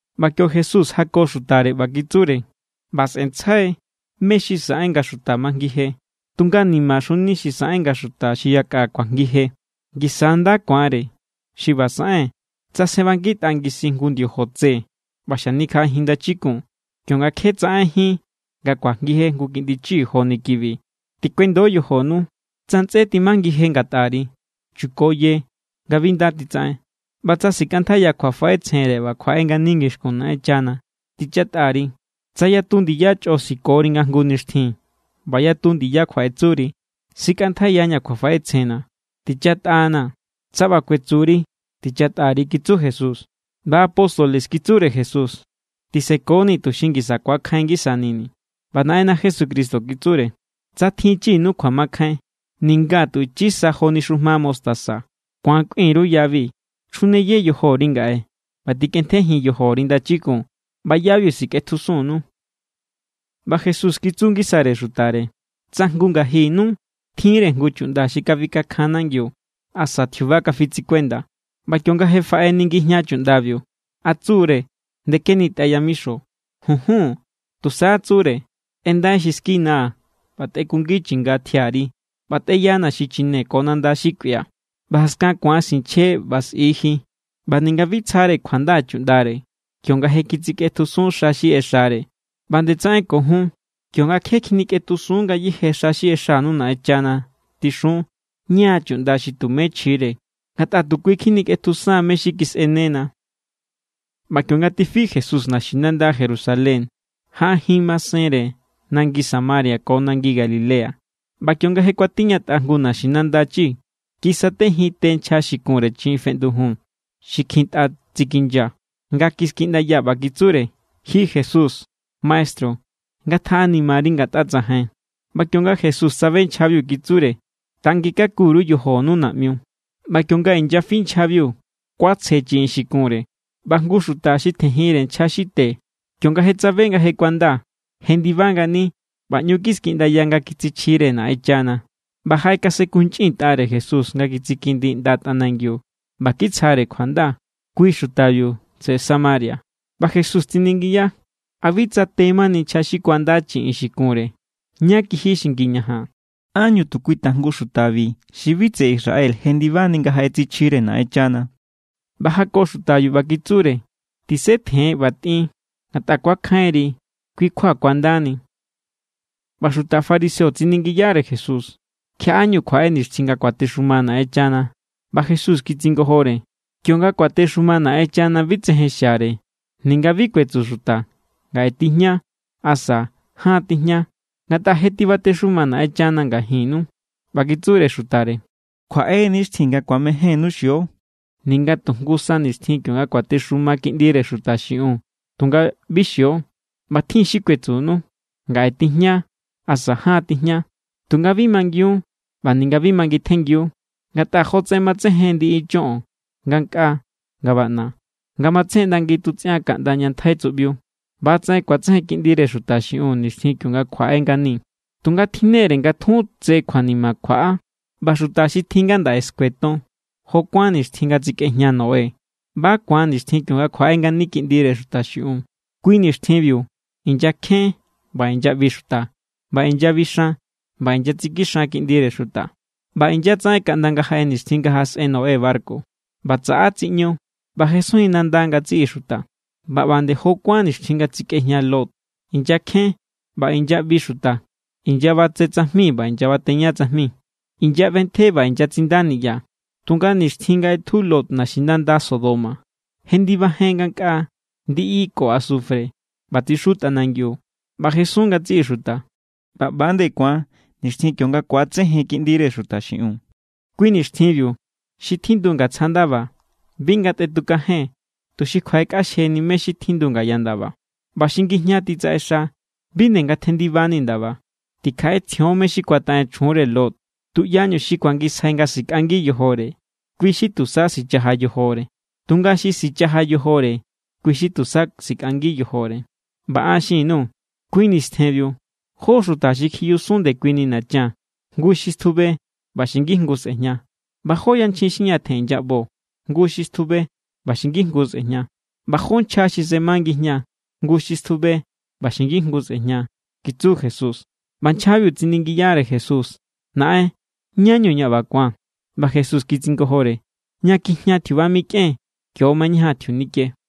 ꞌBa kio Jesús jako xutare, ꞌba kitsure: —ꞌBa sꞌe̱ntsjai mé= xi saꞌen nga xuta majngije, tunga ¡nimaxuni xi saꞌen nga xuta xi yakꞌa kuajngije! Ngisa= nda ku̱anre xi ꞌba saꞌen tsa sjenꞌbangitꞌa ngisin jngu ndiojo tse ꞌba xanikjaꞌajin ndachikun, kionga kje tsaꞌenjín nga kuajngije jngu kiꞌndi chi joni kibi. Tikuendo yojonu. ’Tsa ntsꞌé timajngije ngatꞌari, chukoye nga bi nda titsaꞌen. ꞌBa tsa sikꞌantjaiya kjuafaꞌetsjenre ꞌba kjuaꞌe ngani ngixkun Naꞌenchana, tichatꞌa_ri. Tsa yatu ndiya chꞌo sikori nga jngu nixtjin ꞌba yatu ndiya kjuaꞌetsuri: “Sikꞌantjaiyaña̱ kjuafaꞌetsjenna̱. Tichatꞌanaa̱”, tsa ꞌba kuetsuri, tichatꞌa_ri —kitsu Jesús. ꞌBa apóstoles kitsure Jesús: —Tisekonii̱ tuxi ngisa ku̱akjain ngisanini̱. ꞌBa Naꞌenna Jesucristo kitsure: —Tsa tjinchinu kjuamakjain ninga tu ichi sa joni xujma mostaza, ku̱an kꞌuin_ru yabi: “Chjuneye yojori ngaꞌe ꞌba tꞌikꞌentjejin yojori ndachikun”, ꞌba yabiu sikꞌetjusunnu. ꞌBa Jesús kitsu ngisare xutare: —Tsa jngu ngajinnu tjinre jngu chuꞌnda xi kafikakjan nangiu asa tjiuba kafitsikuenda, ꞌba kionga je faꞌeni ngijña chuꞌndabiu, ¿a tsu=re: “Ndekenitꞌai yamixo”? Junjun. Tusa tsure: “Tꞌendai xi skinaa̱ ꞌba tꞌekungi chinga tjiari nga tꞌeyana xichine ko nanda xi kꞌuia̱, ꞌba jaskan ku̱an sinchje ꞌba sꞌi ji.” ꞌBa ninga bi tsjare kjuanda chuꞌndare kionga je kitsikꞌetjusun xa xi ꞌexare. ꞌBa nde tsaꞌen ko jun, kionga je kjinikꞌetjusun ngayéje xa xi ꞌexanu Naꞌenchana, tixun: “Ña= chuꞌnda xi tumé chjire, ngatꞌa tu kui kjinikꞌetjusan mé= xi kisꞌenena.” ꞌBa kionga tifi Jesús naxinanda Jerusalén, jaꞌajin masenre nangi Samaria ko nangi Galilea. ꞌBa kionga je kuatiñatꞌa jngu naxinanda chi, kisatejin te nchja xi kunre chiꞌin feꞌndujun xi kjintꞌa tsikinya nga kiskiꞌndaya, ꞌba kitsure: —Ji Jesús, maestru, ngatjaꞌanimari ngatꞌa tsajain. ꞌBa kionga Jesús tsabe nchjabiu, kitsure: —Tanginkaku_ru yojonu naꞌmiu. ꞌBa kionga inyafi nchjabiu, kuatsje chiꞌin xi kunre. ꞌBa jngu xuta xi tjenjinre nchja xi te, kionga tsabe nga je kuanda, jendiba ngani ꞌba ꞌñu kiskiꞌndaya nga kitsichjire Naꞌenchana. ꞌBa jaꞌekasenkunchꞌintꞌare Jesús nga kitsikindi ꞌnda tꞌanangiu ꞌba kitsjare kjuanda. Kui xutabiu tseꞌe Samaria. ꞌBa Jesús tsiningiya: —¿A bi tsa te mani nchja xi kuanda chiꞌin xi kunre? ¿Ñá kiji xi ngiñajan? ¿Ánñu tu kui tajngu xutabi xi bi tseꞌe Israel jendibani nga jaꞌetsichjire Naꞌenchana? ꞌBa jako xutabiu, ꞌba kitsure: —Tisetjen ꞌba tꞌin. Ngatꞌa kuakjainri, kui= kjua kuandani. ꞌBa xuta fariseo tsiningiyare Jesús: —¿Kjiaꞌáñu kjuaꞌe nixtjin nga kuatexuma Naꞌenchana? ꞌBa Jesús kitsingojore: —Kionga kuatexuma Naꞌenchana, bi tsejen xiare. Ninga bi kuetsu xuta: “Ngaꞌe tijña”, asa: “Jaan tijña.” Ngatꞌa je tibatexuma Naꞌenchana ngajinnu. ꞌBa kitsure xutare: —Kjuaꞌe= nixtjin nga ku̱amejénnu xio ninga tu jngu sa nixtjin kionga kuatexuma Kiꞌndire Xuta xiꞌiun, tunga bi xio. ꞌBa tjin= xi kuetsunu: “Ngaꞌe tijña”, asa: “Jaan tijña”, tunga bi mangiun ꞌba ninga bi mangintjenngiu. Ngatꞌa jotsaꞌen matsejen ndiꞌi choꞌon ngankꞌaa nga baꞌna, nga matsejen ꞌnda ngitutsꞌian kaꞌnda ña ntjai tsuꞌbiu, ꞌba=tsaꞌen kuatsejen Kiꞌndire Xuta xiꞌiun nixtjin kionga kjuaꞌe ngani. Tunga tjinnere nga tjun tse kjuanima kjuaꞌa, ꞌba xuta xi tjin ngandaꞌe skueton. Jó kuán nixtjin nga tsikꞌejña Noé, ꞌba= ku̱an nixtjin kionga kjuaꞌe ngani Kiꞌndire Xuta xiꞌiun. Kui nixtjinbiu inyakjen ꞌba inyaꞌbi xuta ꞌba inyabixan ꞌba inyatsikixan kiꞌndire xuta. ꞌBa inyatsaꞌen kaꞌnda nga jaꞌe nixtjin nga jaꞌasꞌen Noé barku, ꞌba tsaꞌa tsiꞌñu ꞌba jesunjin nanda ngatsiꞌi xuta. ꞌBa ꞌba nde jo kuán nixtjin nga tsikꞌejña Lot, inyakjen ꞌba inyaꞌbi xuta, inyabatse tsajmi ꞌba inyabateña tsajmi, inyaꞌbentje ꞌba inyatsinda niꞌya. Tunga nixtjin nga ꞌetju Lot naxinanda Sodoma, jendibajen ngankꞌaa ndiꞌi ko asufre ꞌba tsixu tꞌanangiu, ꞌba jesun ngatsiꞌi xuta. ꞌBa ꞌba= ku̱an nixtjin kionga ku̱atsejen Kiꞌndire Xuta xiꞌiun. ’Kui nixtjinbiu, xi tjindu ngatsja ndaba bi ngatꞌetukajen tuxi kjuaꞌekꞌaxjeni mé= xi tjindu ngaya ndaba. ꞌBa xi ngijña titsaꞌexa, bi nde ngatjendibani ndaba. Tikjaꞌetsjion mé= xi kuataꞌen chjunre Lot. Tuꞌyañu xi kuangisjai nga sikꞌangi yojore, kui= xi tusa sichaja yojore. Tunga xi sichaja yojore, kui= xi tusa sikꞌangi yojore. ’ꞌBa an xin_nuu̱. Kui nistjenbiu jó xuta xi kjiyusun ndekuini nachan, jngu xi stjube ꞌba xi ngijngu sꞌe̱jña. ꞌBa jó yanchjin xi ñatjen inyaꞌbo, jngu xi stjube ꞌba xi ngijngu sꞌe̱jña. ꞌBa jó nchja xi sema ngijña, jngu xi stjube ꞌba xi ngijngu sꞌe̱jña —kitsu Jesús. ꞌBa nchjabiu tsiningiyare Jesús: —Naꞌen, ¿ñá=ñu ꞌba ku̱an? ꞌBa Jesús kitsingojore: —Ña kjijña tjiuba mikꞌen, kio= mañajan tjiunike.